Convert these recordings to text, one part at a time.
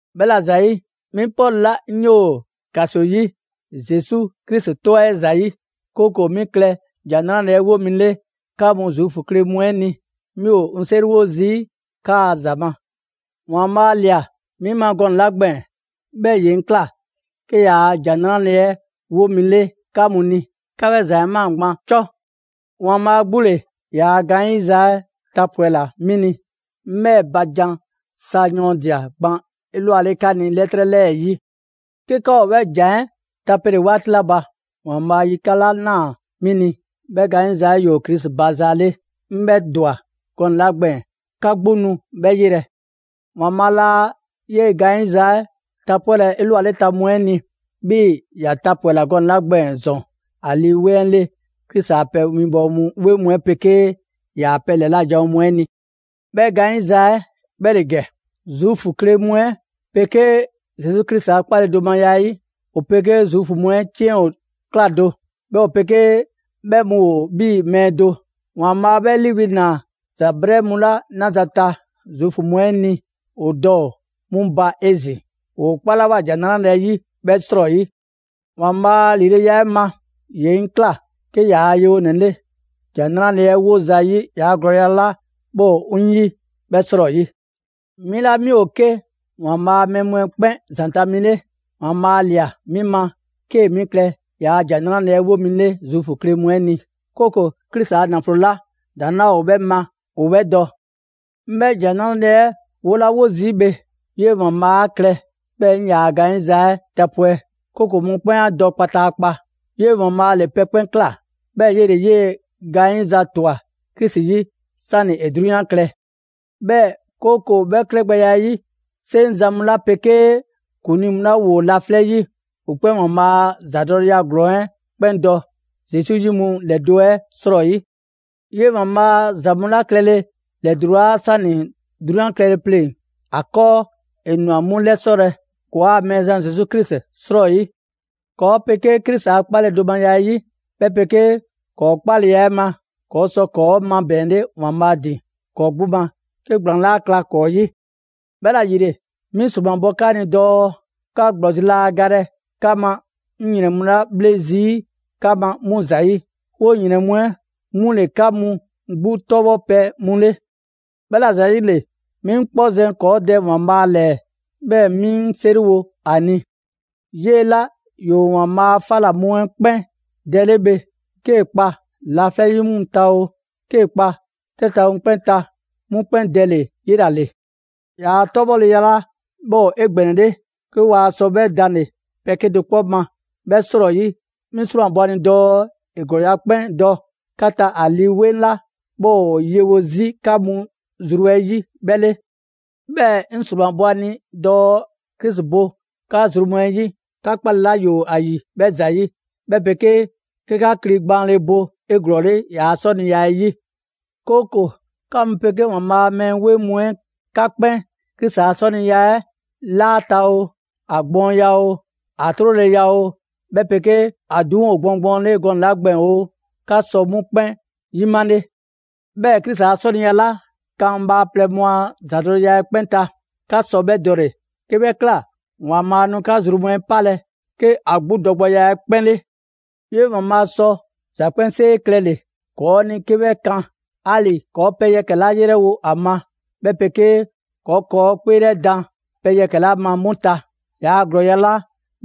'Bhɛla‑ ‑zayi', 'mi Pɔlu 'la 'ŋ 'yoo‑ ‑kaso 'yi Zesu Krisi 'tɔ 'ɛ ‑zayi', 'kooko‑ 'mi klɛ ‑Jan 'Nrale‑ 'ɛ 'wo mi 'le 'ka mu Zuufu kle mu 'ɛ ni, 'mi ‑o 'ŋ 'seriwo zii' 'kaa‑ ‑za ma. ‑Waanbhaa' ꞊lia 'mi ma gɔnɛ‑ 'la gbɛɛn‑, 'bhɛɛ‑ ‑ye 'ŋ ꞊kla 'ke ‑Jan 'Nrale‑ 'ɛ 'wo mi 'le 'ka mu ni, 'ka 'bhɛ ‑za 'ɛ ꞊maa gban 'cɔ. ‑Waanbhaa' 'gbu ‑le ‑yaa' gaanyiza 'ɛ tapwɛla 'mi ni, 'ŋ 'bhɛɛ‑ ba jan sa yɔɔndia‑ gban 'elwale 'ka ni 'lɛtrɛ 'lɛɛ‑ 'yi. 'Ke 'ka ‑o 'bhɛ ‑jan 'ɛ tapele 'waati 'la ba, ‑Waanbhaa' yikan' 'la ꞊naa 'mi ni, 'bhɛɛ‑ gaanyiza 'la ‑yoo Krisi ba za 'le, 'ŋ 'bhɛ ‑dwa gɔnɛ‑ 'la gbɛɛn‑, 'ka 'gbu nu 'bhɛ 'yelɛ‑. ‑Waanbhaa' laa 'yee‑ gaanyiza 'ɛ tapwɛlɛ 'elwaleta mu 'ɛ ni, 'bhii‑ ‑ya tapwɛla gɔnɛ‑ 'la gbɛɛn‑ ‑zɔn ‑a Lii 'Weŋ 'ɛ 'le Krisi a pɛ winbɔwo 'weŋ mu 'ɛ 'pegee ‑yaa' pɛ ‑lɛla' janwo mu 'ɛ ni. 'Bhɛ gaanyiza 'ɛ 'bhɛ ‑le ‑gɛ: Zuufu kle mu 'ɛ 'pegee Zesu Krisi a 'kpaledomaya 'ɛ 'yi, ‑o 'pegee Zuufu mu 'ɛ 'ciɛn ꞊kla do, 'bhɛɛ‑ ‑o 'pegee 'bhɛ mu ‑o 'bhii‑ mɛɛ do. ‑Waanbhaa' 'bhɛ 'liiwli‑ ꞊naa ‑za 'brɛɛ mu 'la 'naza‑ ta Zuufu mu 'ɛ ni ‑o dɔ ‑o 'mu ba 'ezin‑, ‑woo 'kpalawoa ‑Jan 'Nrale‑ 'ɛ 'yi 'bhɛ 'srɔyi. ‑Waanbhaa' a ‑lileya 'ɛ ma, ‑ye 'ŋ ꞊kla 'ke ‑yaa' yewonɛ 'le ‑Jan 'Nrale‑ 'ɛ 'wo zayi' ‑yaa' ‑glɔɔya' 'la 'bhɛ ‑o 'ŋ 'yi 'bhɛ 'srɔyi. 'Mi 'la 'mi ‑o 'ke ‑Waanbhaa' a mɛɛ mu 'ɛ 'kpɛn ‑zanta' mi 'le, ‑Waanbhaa' ꞊lia 'mi ma 'kee‑ 'mi klɛ ‑yaa' ‑Jan 'Nrale‑ 'ɛ 'wo 'mi 'le Zuufu kle mu 'ɛ ni, 'kooko‑ Krisi a ‑naflo 'la ‑daŋ' 'laa ‑o 'bhɛ ma ‑o 'bhɛ dɔ. 'Ŋ 'bhɛ ‑Jan 'Nrale‑ 'ɛ 'wolawo zii' bhe, 'yee‑ ‑Waanbhaa 'a klɛ 'bhɛɛ‑ 'ŋ ‑yaa' gaanyiza 'ɛ tapwɛ', 'kooko‑ mɔkpɛn' 'a dɔ kpataakpa. 'Yee‑ ‑Waanbhaa' ‑le pɛ 'kpɛn ꞊kla, 'bhɛɛ‑ 'yele‑ 'yee‑ gaanyiza ‑twa Krisi 'yi 'sani‑ ‑e 'drunyan klɛ. 'Bhɛɛ‑ 'kooko‑ 'bhɛ klɛgbɛya 'ɛ 'yi, 'seŋzan‑ mu 'la 'pegee ‑kuŋlii mu 'la ‑woo laflɛ' 'yi, ‑o 'kpɛn ‑Waanbhaa' a ‑zadɔleya ‑glɔɔn 'ɛ 'kpɛn dɔ Zesu yi mu ‑lɛdo' 'ɛ 'srɔyi. 'Yee‑ ‑Waanbhaa' ‑za mu 'la klɛle ‑lɛdulaa 'sani‑ 'drunyan klɛle pleŋ‑ ‑a 'kɔɔ, ‑e ꞊nwa 'mu 'lɛsɔlɛ ‑kɔɔa' Mɛɛzan Zesu Krisi 'srɔyi. ‑Kɔɔ' 'pegee Krisi a 'kpaledomaya 'yi, 'bhɛ 'pegee ‑kɔɔ' 'kpaleya 'ɛ ma, ‑kɔɔ' sɔ ‑kɔɔ' 'mabɛɛnle ‑Waanbhaa' ‑din ‑kɔɔ' 'gbu ma 'ke ‑gblaan 'laa kla ‑kɔɔ' 'yi. 'Bhɛla ‑yile, 'mi ‑sromabɔ 'ka ni dɔɔ 'ka ‑gblɔzi' laa galɛ 'ka ma 'ŋ ‑yrɛn mu 'la 'bhle zii' 'ka ma 'mu ‑zayi'. 'Woo‑ ‑yrɛn mu 'ɛ 'mu ‑le 'ka mu 'gbu 'tɔbhɔpɛ mu 'le. 'Bhɛla‑ ‑zayile, 'mi 'ŋ 'kpɔ zɛn ‑kɔɔ' Dɛ ‑Waanbhaa' ‑lɛɛ, 'bhɛɛ‑ 'mi 'ŋ 'seriwo ‑a ni. 'Yee‑ 'la ‑yoo ‑Waanbhaa' a 'fa ‑la mu 'ɛ 'kpɛn Dɛ 'le bhe, 'kee‑ kpa laflɛ' 'yi mu ta oo, 'kee‑ kpa 'trɛ ta mu 'kpɛn ta, 'mu 'kpɛn dɛ ‑le 'yela‑ ‑le ‑Yaa' 'tɔbhɔleya 'la 'bhɛ ‑o 'egbɛnɛle, 'ke waa sɔ 'bhɛ danle‑ pɛ 'kedo‑ 'kpɔ ma 'bhɛ 'srɔyi, 'mi ‑sromabɔ ‑a ni dɔɔ ‑e ‑glɔɔya' 'kpɛn dɔ 'ka ta ‑a Lii 'Weŋ 'la 'bhɛ ‑o yewo 'zi 'ka zru mu 'ɛ 'yi 'bhɛ 'le. 'Bhɛɛ‑ 'ŋ ‑sromabɔ ‑a ni dɔɔ Krisi bo 'ka zru mu 'ɛ 'yi 'ka 'kpale‑ 'la ‑yoo ‑a ‑yi 'bhɛ ‑zayi', 'bhɛ 'pegee 'ke 'ka kli gbaanle bo 'eglɔɔle ‑yaa' 'sɔniya 'ɛ 'yi. 'Kooko‑ 'ka mu 'pegee ‑Waanbhaa' a mɛɛ 'weŋ mu 'ɛ 'ka 'kpɛn Krisi a 'sɔniya 'ɛ 'laata‑ oo, ‑a gbɔɔnya oo, ‑a 'troleya oo, 'bhɛ 'pegee ‑a ‑duŋ' ‑o 'egbɔɔnle gɔnɛ‑ 'la gbɛɛn‑ oo, 'ka sɔ 'mu 'kpɛn 'yimale. 'Bhɛɛ‑ Krisi a 'sɔniya 'la kan bhaaplɛŋ mu a ‑zadɔleya 'ɛ 'kpɛn ta, 'ka sɔ 'bhɛ dɔle‑. 'Ke 'bhɛ ꞊kla, ‑Waanbhaa' nu 'ka zru mu 'ɛ 'palɛ‑ 'ke ‑a 'gbu dɔgbɛya 'ɛ 'kpɛn 'le. 'Yee‑ ‑Waanbhaa' sɔ ‑za 'kpɛnsee klɛle‑ ‑kɔɔ' ni 'ke 'bhɛ kan 'ali‑ ‑kɔɔ' pɛ yɛkɛ‑ 'la 'yrɛwo‑ ‑a ma, 'bhɛ 'pegee ‑kɔɔ' ‑kɔɔ' 'kpeelɛdan pɛ yɛkɛ‑ 'la ma 'mu ta, ‑yaa' ‑glɔɔya' 'la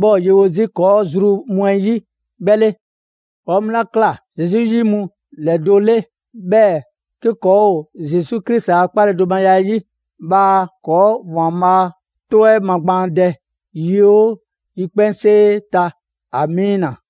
'bhɛ ‑o yewo 'zi ‑kɔɔ' zru mu 'ɛ 'yi 'bhɛ 'le. ‑Kɔɔ' mu 'la ꞊kla Zesu 'yi mu ‑lɛdo' 'le, 'bhɛɛ‑ 'ke ‑kɔɔ' ‑o Zesu Krisi a 'kpaledomaya 'ɛ 'yi, bhaa ‑kɔɔ' ‑Waanbhaa' 'tɔ 'ɛ magbaandɛ yi 'oo yikpɛnsee ta. Amiina!